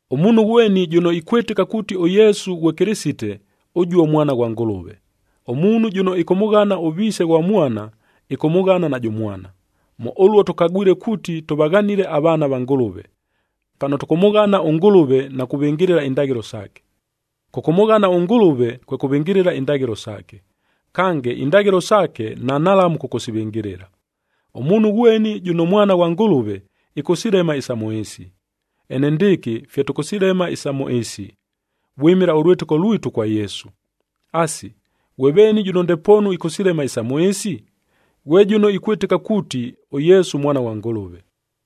Ʉmuunhu ghweni jʉno ikwɨtɨka kuuti ʉYesu ghwe Kɨlɨsite, ʉjuo mwana ghwa Ngʉlʉve. Ʉmuunhu jʉno ɨkʉmʉghana ʉviise ghwa mwana, ɨkʉmʉghana najʉ mwana. Mʉ ʉluo tʉkagwile kuuti tʉvaghanile avaana va Ngʉlʉve, pano tʉkʉmʉghana ʉNgʉlʉve na kuvɨngɨlɨla indaghɨlo saake. Kʉkʉmʉghana ʉNgʉlʉve, kwe kʉvɨngɨlɨla indaghɨlo saake. Kange indaghɨlo saake, nanhalamu kʉkʉsivɨngɨlɨla. Ʉmuunhu ghweni jʉno mwana ghwa Ngʉlʉve, ɨkʉsilema isa mʉ ɨɨsi. Enendɨɨkɨ fye tʉkʉsilema isa mʉ ɨɨsi, vwɨmɨla ʉlwɨtɨko lwitu kwa Yesu. Asi, ghwe veeni jʉno ndepoonu ɨkʉsilema isa mʉ ɨɨsi? Ghwe jʉno ikwɨtɨka kuuti, ʉYesu Mwana ghwa Ngʉlʉve.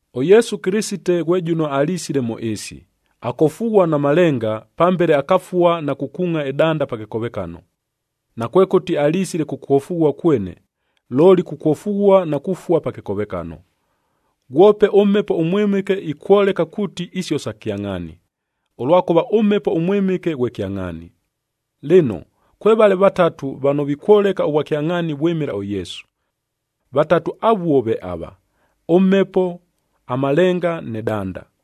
ɄYesu Kɨlɨsite ghwe jʉno alisile mʉ ɨɨsi, akofughua na malenga, pambele akafua na kukuungʼa ɨdanda pa kɨkovekano. Nakwekʉti alisile kukwofughua kwene, looli kukwofughua na kufua pa kɨkovekano. Ghwope ʉMhepo ʉMwɨmɨke ikwoleka kuuti isio sa kyangʼhaani, ʉlwakʉva ʉMhepo ʉMwɨmɨke ghwe kyangʼhaani. Lɨno, kwevale vatatu vano vikwoleka ʉvwakyangʼhaani vwɨmɨla ʉYesu. Vatatu avuo ve ava: ʉMhepo, amalenga nɨ danda.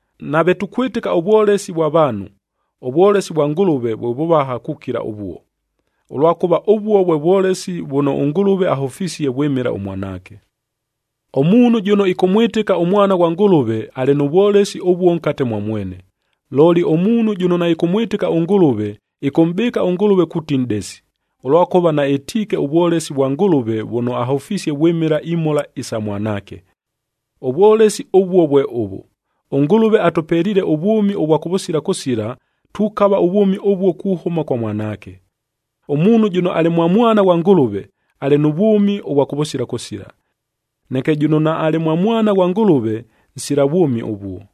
Nave tukwɨtɨka ʉvwolesi vwa vaanhu, ʉvwolesi vwa Ngʉlʉve vwe vʉvaha kukila ʉvuo, ʉlwakʉva ʉvuo vwe vwolesi vʉno ʉNgʉlʉve ahʉfisie vwɨmɨla ʉMwanaake. Ʉmuunhu jʉno ɨkʉmwɨtɨka ʉMwana ghwa Ngʉlʉve, alɨ nʉ vwolesi ʉvuo nkate mwa mwene. Looli ʉmuunhu jʉno naɨkʉmwɨtɨka ʉNgʉlʉve, ɨkʉmʼbɨɨka ʉNgʉlʉve kuuti nʼdesi, ʉlwakʉva naɨtiike ʉvwolesi vwa Ngʉlʉve vʉno ahʉfisie vwɨmɨla imhola isa Mwanaake. Ʉvwolesi ʉvuo vwe ʉvʉ: ɄNgʉlʉve atʉpeliile ʉvwʉmi ʉvwa kʉvʉsila kʉsila, tukava ʉvwʉmi ʉvuo kuhʉma kwa Mwanaake. Ʉmuunhu jʉno alɨ mwa Mwana ghwa Ngʉlʉve, alɨ nʉ vwʉmi ʉvwa kʉvʉsila kʉsila. Neke jʉno naalɨ mwa Mwana ghwa Ngʉlʉve, nsila vwʉmi ʉvuo.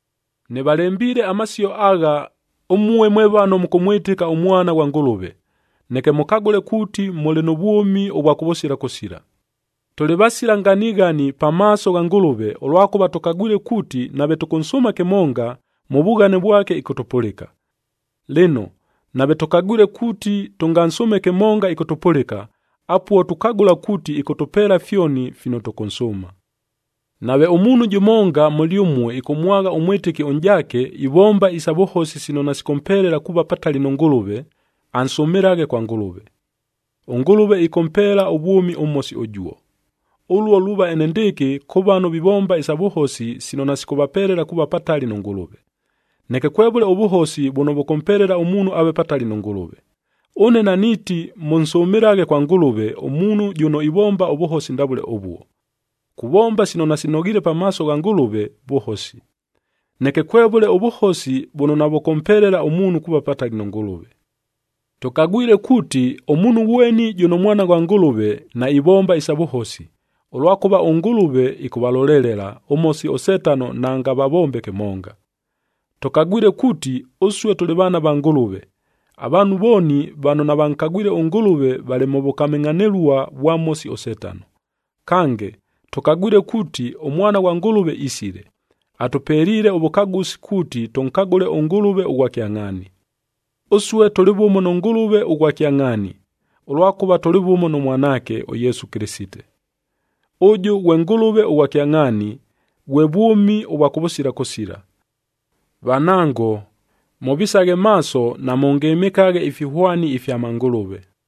Nɨvalembiile amasio agha, ʉmue mwe vano mʉkʉmwɨtɨka ʉMwana ghwa Ngʉlʉve, neke mʉkagʉle kuuti mʉlɨ nʉ vwʉmi ʉvwa kʉvʉsila kʉsila. Tʉlɨ vasila nganighani pamaaso gha Ngʉlʉve, ʉlwakʉva tʉkagwile kuuti nave tʉkʉnsʉʉma kɨmonga, mʉ vughane vwake, ɨkʉtʉpʉlɨka. Lɨno, nave tʉkagwile kuuti tʉngansʉʉme kɨmonga, ɨkʉtʉpʉlɨka, apuo tukagʉla kuuti ɨkʉtʉpeela fyoni fino tʉkʉnsʉʉma. Nave ʉmuunhu jʉmonga mʉlyʉmue ɨkʉmwagha ʉmwɨtɨki ʉnʼjaake, ivomba isa vʉhosi sino nasikʉmpelela kuuva patali nʉ Ngʉlʉve,b ansʉmɨlaghe kwa Ngʉlʉve. ɄNgʉlʉve ɨkʉmpeela ʉvwʉmi ʉmhosi ʉjuo. Ʉluo luuva enendɨɨkɨ kʉ vano vivomba isa vʉhosi sino nasikʉvapelela kuuva patali nʉ Ngʉlʉve. Neke kwevʉle ʉvʉhosi vʉno vʉkʉmpelela ʉmuunhu aave patali nʉ Ngʉlʉve. Ʉne naniiti mʉnsʉmɨlaghe kwa Ngʉlʉve, ʉmuunhu jʉno ivomba ʉvʉhosi ndavʉle ʉvuo. Kuvomba sino nasinoghiile pamaaso gha Ngʉlʉve, vʉhosi. Neke kwevʉle ʉvʉhosi vʉno navʉkʉmpelela ʉmuunhu kuuva patali nʉ Ngʉlʉve. Tʉkagwile kuuti, ʉmuunhu ghweni jʉno mwana ghwa Ngʉlʉve, naivomba isa vʉhosi, ʉlwakʉva ʉNgʉlʉve ɨkʉvalolelela, ʉMhosi ʉSetano naangavavombe kɨmonga. Tʉkagwile kuuti, ʉsue tʉlɨ vaana va Ngʉlʉve. Avaanhu vooni vano navankagwile ʉNgʉlʉve valɨ mʉ vʉkamɨngʼhanɨlua vwa Mhosi ʉSetano. Kange, tʉkagwile kuuti ʉMwana ghwa Ngʉlʉve isile, atʉpeliile ʉvʉkagʉsi kuuti tʉnkagʉle ʉNgʉlʉve ʉghwa kyangʼhaani. Ʉsue tʉlɨ vʉmo nʉ Ngʉlʉve ʉghwa kyangʼhaani, ʉlwakʉva tʉlɨ vʉmo nʉ Mwanaake, ʉYesu Kɨlɨsite. Ʉjʉ ghwe Ngʉlʉve ʉghwa kyangʼhaani, ghwe vwʉmi ʉvwa kʉvʉsila kʉsila. Vanango, mʉvisaghe maaso namʉngɨmɨkaghe ifihwani ifya mangʉlʉve.